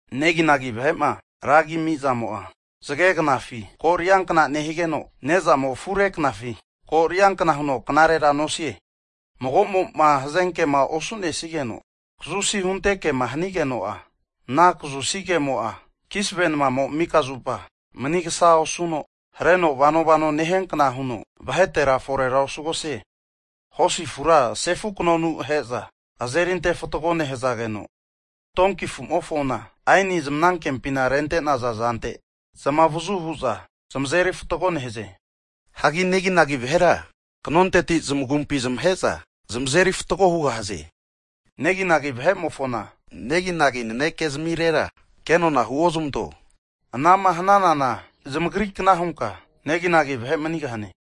Neginagi vahe'ma ragima amizamo'a, zage knafi ko' ariankna nehigeno, ne'zamo afure knafi ko' ariankna huno knarera nosie. Magomo'ma hazenkema osu'nenigeno kazusi hunte kema hanigeno'a, ana kazusi kemo'a kisave namamo mika zupa mnigsa osuno hareno vano vano nehiankna huno, vahetera forera osugahie. Hosi afura sefu knonu ahe'za azeri antefatgo nehazageno, donki afumofona aeni zamagipina rentenaza zante zamavazu huza zmazeri fatgo nehaze. Hagi neginagi vahera knonteti zamagumpi zamahe'za zmazeri fatgo hugahaze. Neginagi vahe'mofona neginagi naneke zamirera kenona huozamanto, anama hananana zamagri kna hunka neginagi vahe manigahane.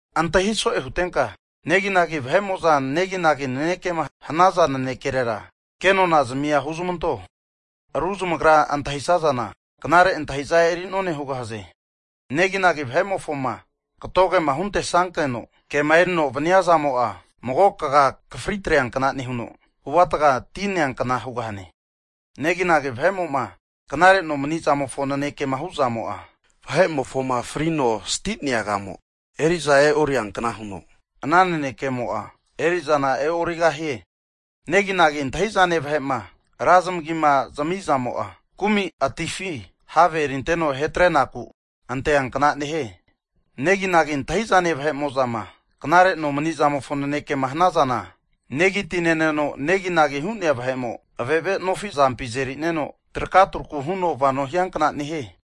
Antahiso'e hutenka neginagi vahe'mo'za, neginagi nanekema hanaza nanekerera, kenona zmia huzamanto, ru zamagra antahisazana knare antahiza eri'none hugahaze. Neginagi vahe'mofoma katogema huntesankeno kema erino vaniazamo'a, mago kaga akafri atreankna nehuno, avuatga ti neankna hugahane. Neginagi vahe'mo'ma knare nomanizamofo nanekema hu'zamo'a, vahe'mofoma frino sti'nea agamo eri'za e'oriankna huno, ana naneke'amo'a erizana e'origahie. Neginagi antahizane vahe'ma ra zamagima zmizamo'a, kumi'atifima have erinteno ahe atrenaku anteankna nehie. Neginagi antahizane vahe'mozama knare nomanizamofo naneke hanazana, negi ti neno neginagi hu'nea vahe'mo, ave ave nofi azampi azerineno traka truku huno vano hiankna nehie.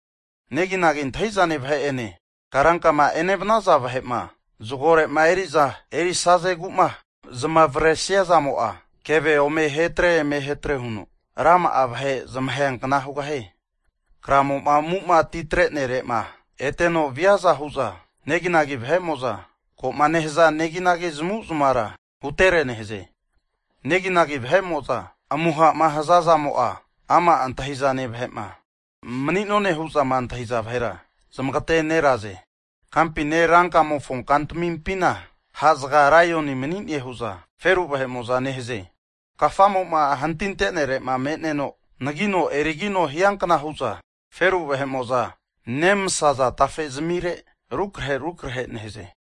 Neginagi antahizane vahe'ene karankama enevanaza vahe'ma zgorema eri'za erisazegu'ma zamavresia zamo'a, keve ome ahetre emehetre huno rama'a vahe zamaheankna hugahie. Kramo'ma amu'ma atitrenere'ma eteno viaza hu'za neginagi vahe'mo'za koma nehaza neginagi zamavu'zmavara hutere nehaze. Neginagi vahe'mo'za amuhama hazazamo'a, ama' antahizane vahe'ma mani'none hu'za antahiza vahera zamagateneraze. Kampine ra kumamofo kantamimpina ha' zga laioni manine hu'za feru vahe'mo'za nehaze! Kafamo'ma hantintenare'ma me'neno anagino erigino hiankna hu'za, feru vahe'mo'za nemasaza tafe zamire, rukrahe rukrahe nehaze.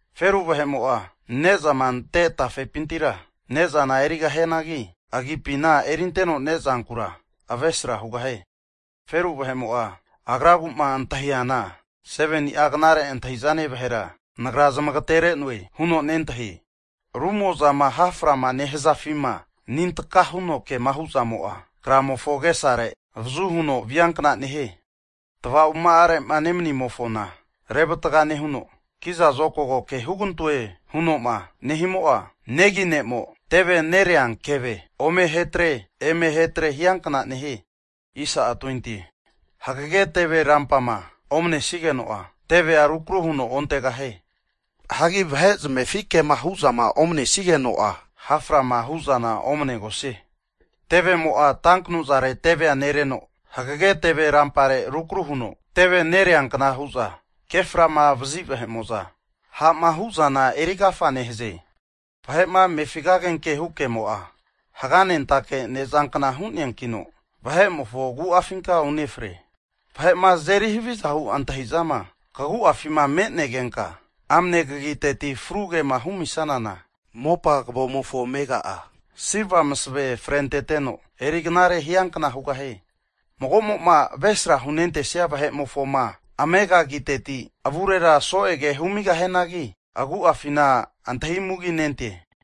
Feru vahe'mo'a ne'zama ante tafepintira ne'zana erigahianagi, agipina erinteno nezankura avesra hugahie. Feru vahe'mo'a agraguma antahiana, 7nia knare antahizane vahera, nagra zamageterenoe huno nentahie. Rumozama ha' frama nehazafima, anintka huno kema hu'zamo'a, kramofo agesare avazu huno viankna nehie. Tava'oma'are nemanimofoma revatga nehuno, kiza zokago ke hugantoe hunoma nehimo'a, negi ne'mo teve nerea keve ome ahetre eme ahetre hiankna nehie. Hagege teve rampama omanesigeno'a, tevea rukru huno ontegahie. Hagi vahe zamefi kema hu'zama omanesigeno'a, ha' frama hu'zana omanegosie. Tevemo'a tanknuzare tevea nereno hagage teve rampare rukru huno tevea nereankna hu'za keframa vazi vahe'mo'za, ha'ma hu'zana eri agafa nehaze. Vahe'ma amefi agenke hu kemo'a, haganentake ne'zankna hu'neankino, vahe'mofo agu'afinka unefre. Vahe'ma azeri havizahu antahizama kagu'afima me'negenka, amne kagitetima fru kema humisanana, mopa kavomofo amega'a silva masave frenteno eri knare hiankna hugahane. Magomo'ma avesra hunentesia vahe'mofoma amega agiteti avurera so'e ke humigahianagi, agu'afina antahi muginente.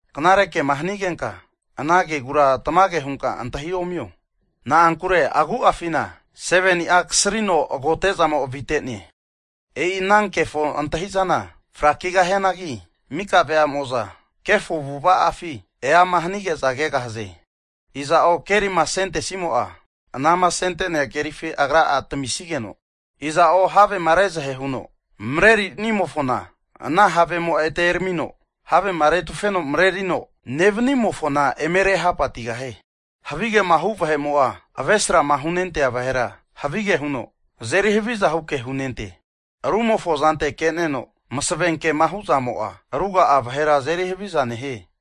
Knare kema hanigenka ana kegura tamage hunka antahiomio, na'ankure agu'afina 7ni'a kasrino agote'zamo avitene. E'i ana kefo antahi'zana frakigahianagi, mika veamo'za, kefo avu'ava'afi eama hanige'za kegahaze. Iza'o kerima asentesimo'a, anama asentesia kerifi agra'a tamisigeno, iza'o havema rezahe huno mrenerinimofona, ana havemo'a ete eramino havema retufeno mrerino nevanimofona eme rehapatigahie. Havi kema hu vahe'mo'a, avesrama hunentea vahera, havige huno azeri havizahu ke hunente. Rumofo zante ke'neno masave kema hu'zamo'a, ruga'a vahera azeri haviza nehie.